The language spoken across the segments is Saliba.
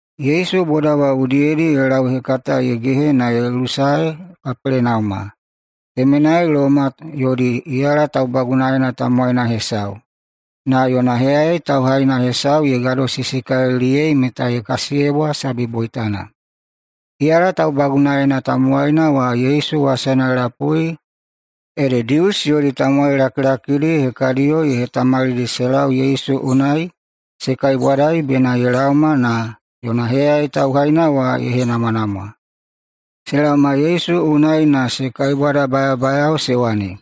Yesu boda wa udiyedi ye lauhekata ye gehe na ye lusae Kapelenauma. Temenai Loma yodi iyala taubagunaena tamowaina hesau, na yona heyayai tauhaina hesau ye gadosisikaliliyei meta ye kasiyebwa sabi boitana. Iyala taubagunaena tamowaina wa Yesu wasana ye lapui ede Dius yodi tamowai lakilakidi hekadiyo ye hetamalidi se lau Yesu unai se kaibwadai bena ye laoma na yona heyayai tauhaina wa ye henamwanamwa. Se laoma Yesu unai na se kaibwadabayabayao se wane,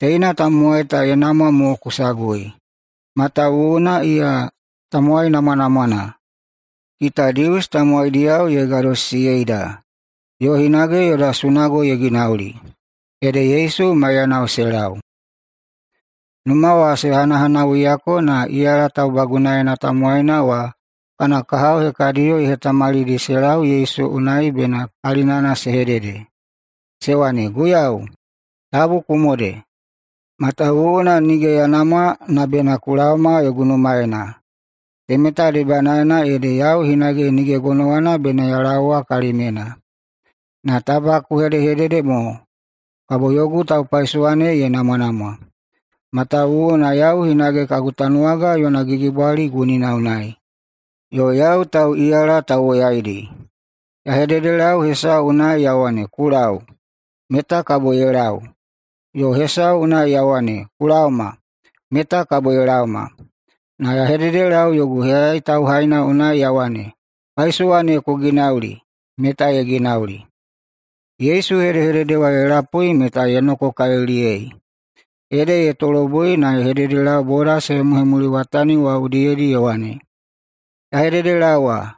“Teina tamowai ta ye namwa mo ku sagui,[matawuwuna iya tamowai namwanamwana.] Kita Dius tamowaidiyao ye gadosisiyeida, yo hinage yoda sunago ye ginauli.” Ede Yesu maiyanao se lau. Numa wa se hanahanawuiyako na iyala taubagunaena tamowaina wa kana kahao hekadiyo ye hetamalidi se lau Yesu unai bena kalinana se hedede. Se wane, “Guiyau, tabu ku mode, matawuwuna nige ya namwa na bena ku laoma yogu numaena. Temeta debanaena ede yau hinage nige gonowana bena ya laowa kalimyena. Na taba ku hedehedede mo, kabo yogu taupaisowa ne ye namwanamwa. Matawuwuna yau hinage kagu tanuwaga yona gigibwali gunina unai, yo yau tauꞌiyala tauwoyaidi. Ya hededelau hesau unai ya wane, ‘Ku lau!’, meta kabo ye lau. Yo hesau unai ya wane, ‘Ku laoma!’, meta kabo ye laoma. Na ya hededelau yogu heyayai tauhaina unai ya wane, ‘Paisowa ne ku ginauli!’, meta ye ginauli.” Yesu hedehedede wa ye lapui meta ye nokokaliliyei. Ede ye tolobui na ye hededelau boda se hemuhemuliwatani wa udiyedi ye wane, “Ya hededelaowa,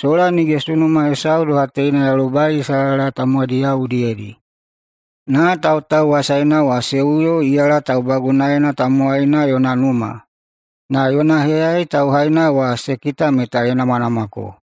sola nige sunuma hesau doha teina ya lobai Isalaela tamowaidiyao udiyedi.” Na tautauwasaina wa se uyo iyala taubagunaena tamowaina yona numa, na yona heyayai tauhaina wa se kita meta ye namwanamwako.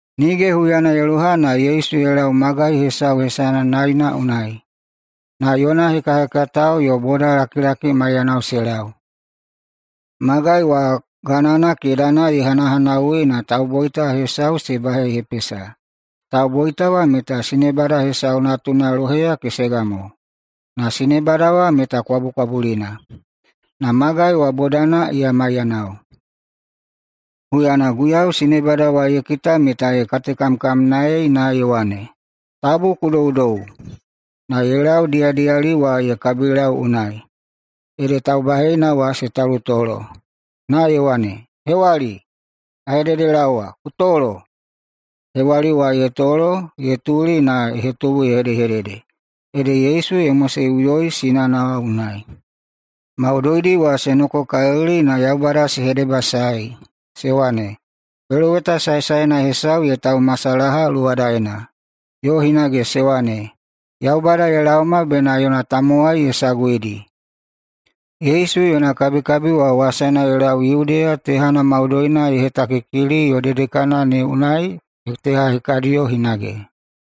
Nige huyana ye loha, na Yesu ye lau magai hesau hesana Naina unai, na yona hekahekatao yo bodalakilaki maiyanao se lau. Magai wa ganana kedana ye hanahanawui na tauboita hesau se bahehepesa. Tauboita wa meta sinebada hesau natuna loheya kesega mo, na sinebada wa meta kwabukwabulina. Na magai wa bodana iya maiyanao. Huyana Guiyau sinebada wa ye kita meta ye katekamkamnaei na ye wane, “Tabu ku doudou!” Na ye lau diyadiyali wa ye kabilau unai, ede taubaheina wa se talutolo. Na ye wane, “Hewali, ya hededelaowa, ku tolo!” Na hewali wa ye tolo ye tuli na ye hetubu ye hedehedede. Ede Yesu ye moseꞌuyoi sinana wa unai. Maudoidi wa se nokokalili na Yaubada se hedebasaei, se wane, “Peloweta saesaena hesau ye taumasalaha luwadaena!” Yo hinage se wane, “Yaubada ye laoma bena yona tamowai ye saguidi.” Yesu yona kabikabi ta wasana ye lau Yudeya tehana maudoina ye hetakikili yo dedekana ne unai teha hekadiyo hinage.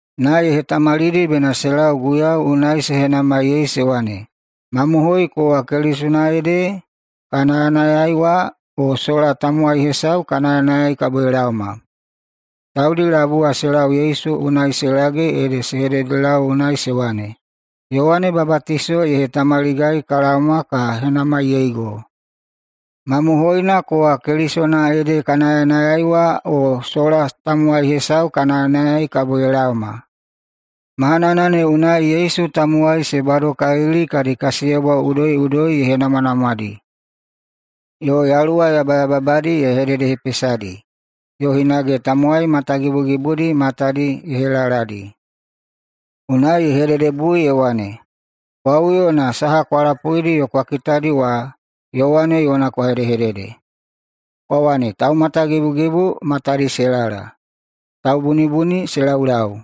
na ye hetamalidi bena se lau Guiyau unai se henamai se wane, “Mamohoina kowa Kelisona ede ka nayanayai wa, o sola tamowai hesau ka nayanayai kabo ye laoma?” Taudi labui wa se lau Yesu unai se lage ede se hededelau unai se wane, “Yowane Babatiso ye hetamaligai ka laoma ka henamaiyeigo: ‘Mamohoina kowa Kelisona ede ka nayanayai wa, o sola tamowai hesau ka nayanayai kabo ye laoma?’” Mahanana ne unai Yesu tamowai se badokalili kadi kasiyebwa udoiꞌudoi ye henamwanamwadi, yo yaluwa yabayababadi ye hededehepesadi, yo hinage tamowai matagibugibudi matadi ye helaladi. Unai ye hededebui ye wane, “Kwa uyo na saha kwa lapuidi yo kwa kitadi wa Yowane yona kwa hedehedede, kwa wane, Taumatagibugibu matadi se lala, taubunibuni se laulau,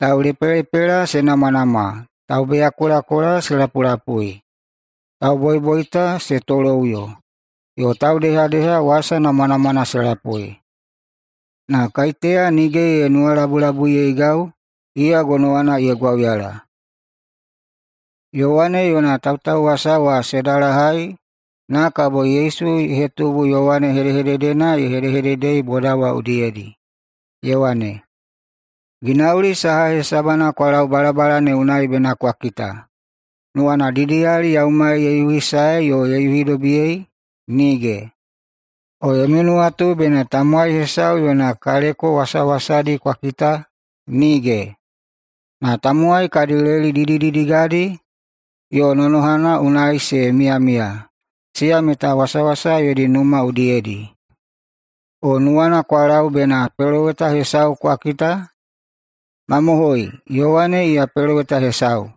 taulepelepela se namwanamwa, taubeyakolakola se lapulapui, tauboiboita se toloꞌuyo, yo taudehadeha wasa namwanamwana se lapui. Na kaiteya nige ye nuwalabulabuiyeigau, iya gonowana ye gwauyala!” Yowane yona tautauwasa wa se dalahai, na kabo Yesu ye hetubu Yowane hedehededena ye hedehededei boda wa udiyedi, ye wane, “Ginauli saha hesabana kwa lau balabala ne unai bena kwa kita? Nuwana didiyali yaumai ye yuhisaei yo ye yuhidobiyei? Nige! O yomi nuwatu bena tamowai hesau yona kaleko wasawasadi kwa kita? Nige! Na tamowai kadi leli didididigadi yo nonohana unai se miyamiya, siya meta wasawasa yodi numa udiyedi. O nuwana kwa lau bena peloweta hesau kwa kita? Mamohoi, Yowane iya peloweta hesau.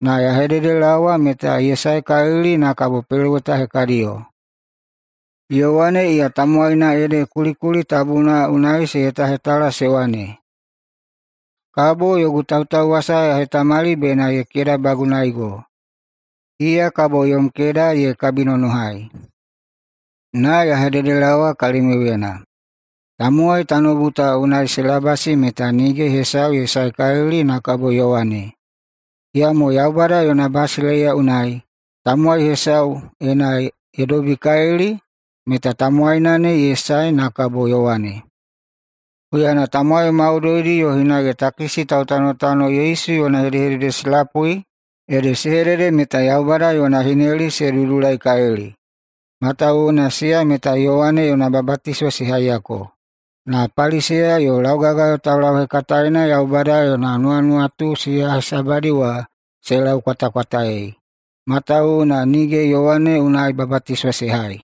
Na ya hededelaowa meta ye saekalili na kabo peloweta hekadiyo. Yowane iya tamowaina ede kulikuli tabuna unai se hetahetala se wane, ‘Kabo yogu tautauwasa ya hetamali bena ye kedabagunaego. Iya kabo yom keda ye kabinonohai.’ Na ya hededelaowa kalimiuyena: Tamowai tanoubu ta unai se labasi meta nige hesau ye saekalili na kabo Yowane. Iyamo Yaubada yona basileiya unai, tamowai hesau, ena ye dobikalili, meta tamowaina ne ye sae na kabo Yowane.” Huyana tamowai maudoidi yo hinage takisi tautanotano Yesu yona hedehedede se lapui, ede se hedede meta Yaubada yona hineli se dudulaikalili, matawuwuna siya meta Yowane yona babatiso se haiyako. Na Paliseya yo laugagayo taulauhekataena Yaubada yona nuwanuwatu siya hesabadi wa se laukwatakwataei, matawuwuna nige Yowane unai babatiso se hai.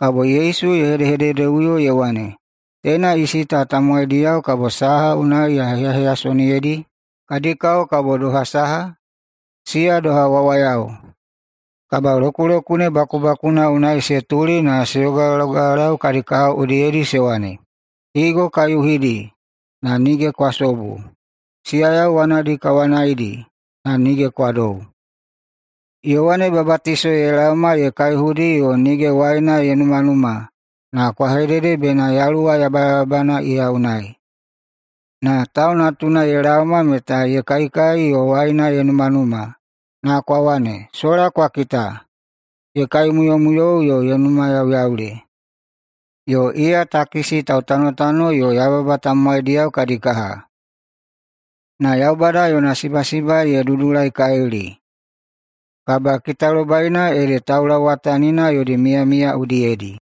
[Kabo Yesu ye hedehededeꞌuyo ye wane,] “Teina isi ta tamowaidiyao kabo saha unai ya heyaheyasoniyedi? Kadi kao kabo doha saha? Siya doha wawayao, kabalokulokune bakubakuna unai se tuli na se yogayogalau kadi kahao udiyedi se wane, ‘Higo ka yuhidi, na nige kwa sobu. Siyayau wanadi ka wanaidi, na nige kwa dou.’ Yowane Babatiso ye laoma ye kaihudi yo nige waina ye numanuma na kwa hedede bena yaluwa yabayababana iya unai. Na Tau Natuna ye laoma meta ye kaikai yo waina ye numanuma na kwa wane, ‘Sola kwa kita, ye kaimuyomuyou yo ye numayauyaule! Yo iya takisi tautanotano yo yababa tamowaidiyao kadi kaha!’ Na Yaubada yona sibasiba ye dudulaikalili. Kabakitalobaina ede taulauwatanina yodi miyamiya udiyedi.”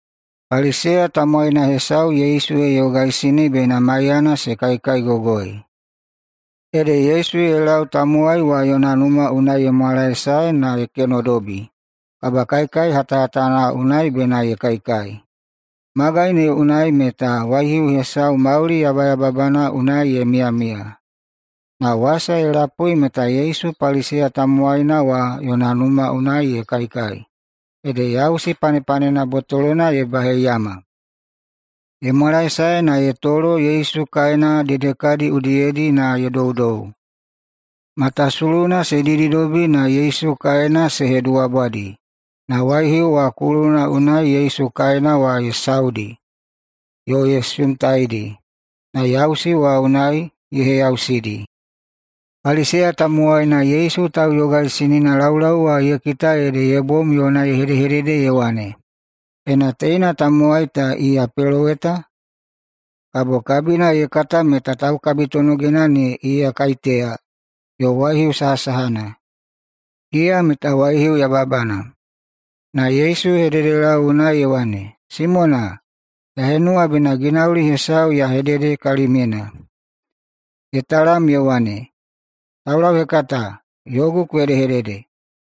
Paliseya tamowaina hesau Yesu ye yogaisini bena maiyana se kaikaigogoi. Ede Yesu ye lau tamowai wa yona numa unai ye mwalae na ye kenodobi kabakaikai hatana unai bena ye kaikai. Magai ne unai meta waihiu hesau mauli yabayababana unai ye miyamiya. Na wasa ye lapui meta Yesu Paliseya tamowaina wa yona numa unai ye kaikai, ede yausi panepanena botolona ye baheiyama. Ye mwalaesae na ye tolo Yesu kaena dedekadi udiyedi na ye doudou. Matasuluna se dididobi na Yesu kaena se heduwabwadi, na waihiu wa kuluna ne unai Yesu kaena wa ye saudi yo ye sumtaidi, na yausi wa unai ye heyausidi. Paliseya tamowaina Yesu tauyogaisinina laulau wa ye kita ede ye bom yona ye hedehedede ye wane, “Ena teina tamowai ta iya peloweta, kabo kabina ye kata meta taukabitonogina ne iya kaiteya yo waihiu sahasahana. Iya meta waihiu yababana!” Na Yesu ye hededelau unai ye wane, “Simona, ya henuwa bena ginauli hesau ya hedede kalimyena.” Ye talam ye wane, “Taulauhekata, yogu ku hedehedede.”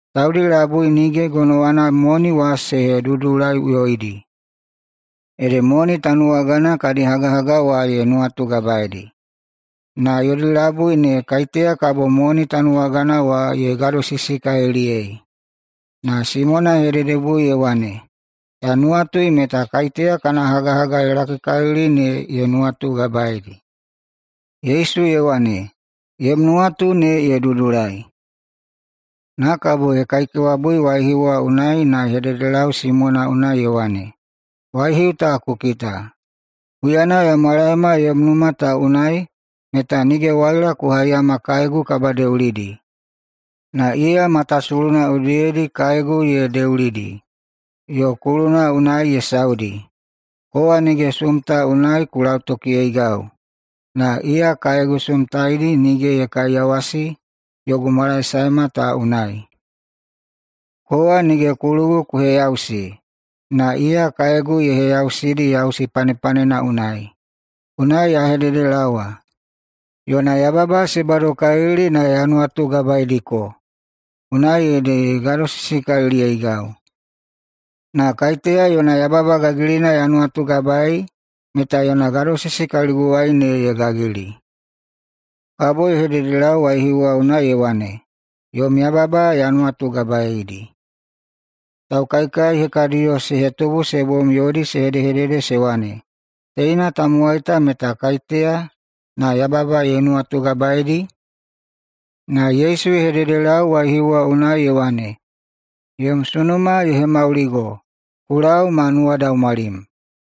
Taudi labui nige gonowadi moni wa se hedudulaiꞌuyoidi, ede moni tanuwagana kadi hagahaga wa ye nuwatugabaeidi. Na yodi labui ne, kaiteya kabo moni tanuwagana wa ye gadosisikaliliyei?” Na Simona ye hededebui ye wane, “Ya nuwatui meta kaiteya kana hagahaga ye lakikalili ne ye nuwatugabaei.” Yesu ye wane, “Yom nuwatu ne ye dudulai.” Na kabo ye kaikewabui waihiu wa unai na ye hededelau Simona unai ye wane, “Waihiu ta ku kita? Huyana ya mwalaema yom numa ta unai meta nige waila ku haiyama kaegu kabadeulidi. Na iya matasuluna udiyedi kaegu ye deulidi yo kuluna unai ye saudi. Kowa nige sumta unai ku lautokiyeigau, na iya kaegu sumtaidi nige ye hekaiyawasi yogu mwalaesaema ta unai. Kowa nige kulugu ku heyausi, na iya kaegu ye heyausidi yausi panepanena unai. Unai ya hededelaowa: Yona yababa se badokalili na ya nuwatugabaeidiko, unai ede ye gadosisikaliliyeigau. Na kaiteya yona yababa gagilina ya nuwatugabaei meta yona gadosisi kaliguwai ne ye gagili.” Kabo ye hededelau waihiu wa unai ye wane, “Yom yababa ya nuwatugabaeidi.” Taukaikai hekadiyo se hetubu se bom yodi se hedehedede se wane, “Teina tamowai ta meta kaiteya na yababa ye nuwatugabaedi?” Na Yesu ye hededelau waihiu wa unai ye wane, “Yom sunuma ye hemauligo. Ku lau ma nuwadaumwalim.”